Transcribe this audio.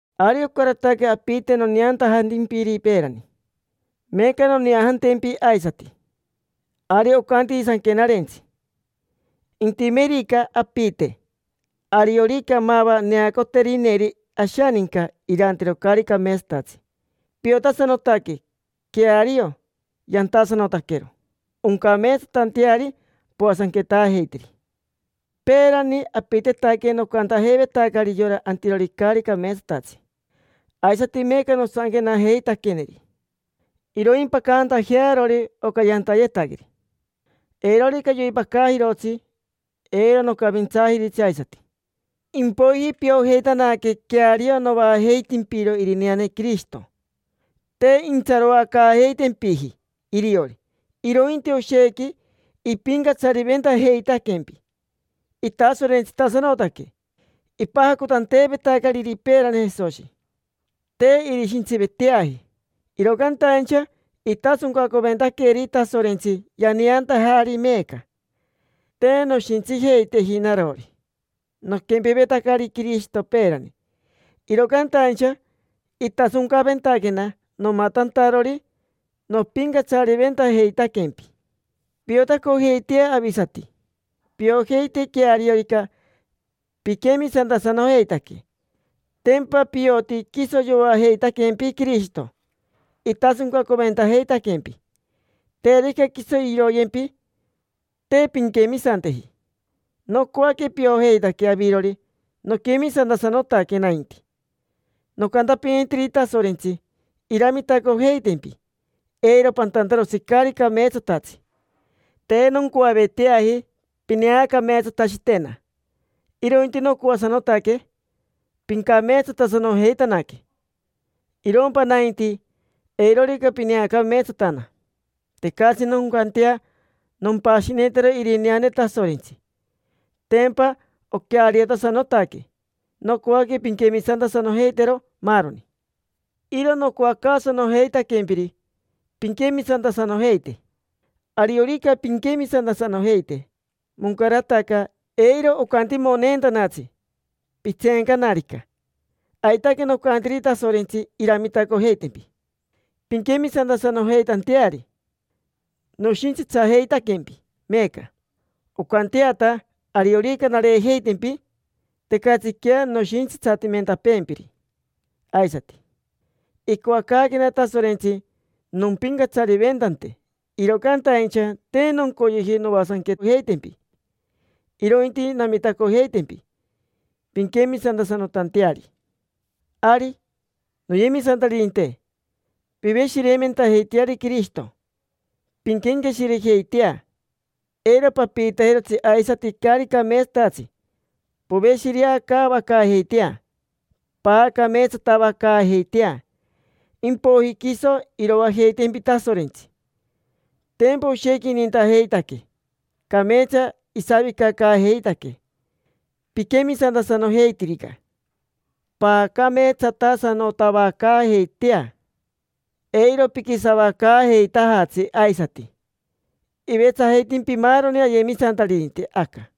Ari ocarataque apite noneantajantimpiri peerani, meeca noneajantempi aisati. Ari ocantini Sanquenarentsi: “Intimerica apite, ariorica mava neacoterineri ashaninca irantero caari cameetsatatsi, piotasanotaque queario yantasanotaquero, oncameetsatanteari poasanquetaajeiteri”. Peerani apitetaque nocantajeivetacari yora antirori caari cameetsatatsi, aisati meeca nosanquenajeitaqueneri iroimpacantajearori oca yantayetaqueri. Eirorica yoipacajirotsi eiro nocavintsaajiritsi aisati. Impoiji piojeitanaque queario novaajeitimpiro irineane Quirishito. Te intsaroacaajeitempiji iriori, irointi oshequi ipincatsariventajeitaquempi, itasorentsitasanotaque. Ipajacotanteevetacariri peerani Jesoshi, te irishintsiveteaji, iro cantaincha itasoncacoventaqueri Tasorentsi, yaneantajari meeca. Te noshintsijeiteji narori, noquempevetacari Quirishito peerani. Iro cantaincha itasoncaventaquena, nomatantarori nopincatsariventajeitaquempi. Piotacojeitea avisati, piojeite queariorica piquemisantasanojeitaque. Tempa pioti quiso yoajeitaquempi Quirishito, itasoncaventajeitaquempi. Terica quiso iroyempi, te pinquemisanteji. Nocoaque piojeitaque avirori noquemisantasanotaque nainti. Nocantapinitiri Tasorentsi iramitacojeitempi eiro pantantarotsi caari cameetsatatsi. Te noncoaveteaji pineacameetsatashitena, irointi nocoasanotaque pincameetsatasanojeitanaque. Irompa nainti, eirorica pineacameetsatana. Tecatsi noncantea nompashinitero irineane Tasorentsi: tempa oqueariotasanotaque; nocoaque pinquemisantasanojeitero, maaroni. Iro nocoacaasanojeitaquempiri pinquemisantasanojeite. Ariorica pinquemisantasanojeite, moncarataca, eiro ocantimoneentanatsi pitseencanarica. Aitaque nocantiri Tasorentsi iramitacojeitempi pinquemisantasanojeitanteari. Noshintsitsajeitaquempi meeca, oncanteata ariorica nareejeitempi tecatsiquea noshintsitsatimentapeempiri aisati. Icoacaaquena Tasorentsi nompincatsariventante, iro cantaincha te noncoyeji noasanquejeitempi, irointi namitacojeitempi pinquemisantasanotanteari. Ari, noyemisantaririnte, piveshireimentajeiteari Quirishito. Pinquenqueshirejeitea, eiro papiitajirotsi aisati caari cameetsatatsi. Poveshireacaavacaajeitea, paacameetsatavacaajeitea, impoiji quiso iroajeitempi Tasorentsi. Tempa oshequi inintajeitaquee, cameetsa isavicacaajeitaquee. Piquemisantasanojeitirica, paacameetsatasanotavacaajeitea: eiro piquisavacaajeitajatsi aisati. Ivetsajeitimpi maaroni ayemisantaririnte aca.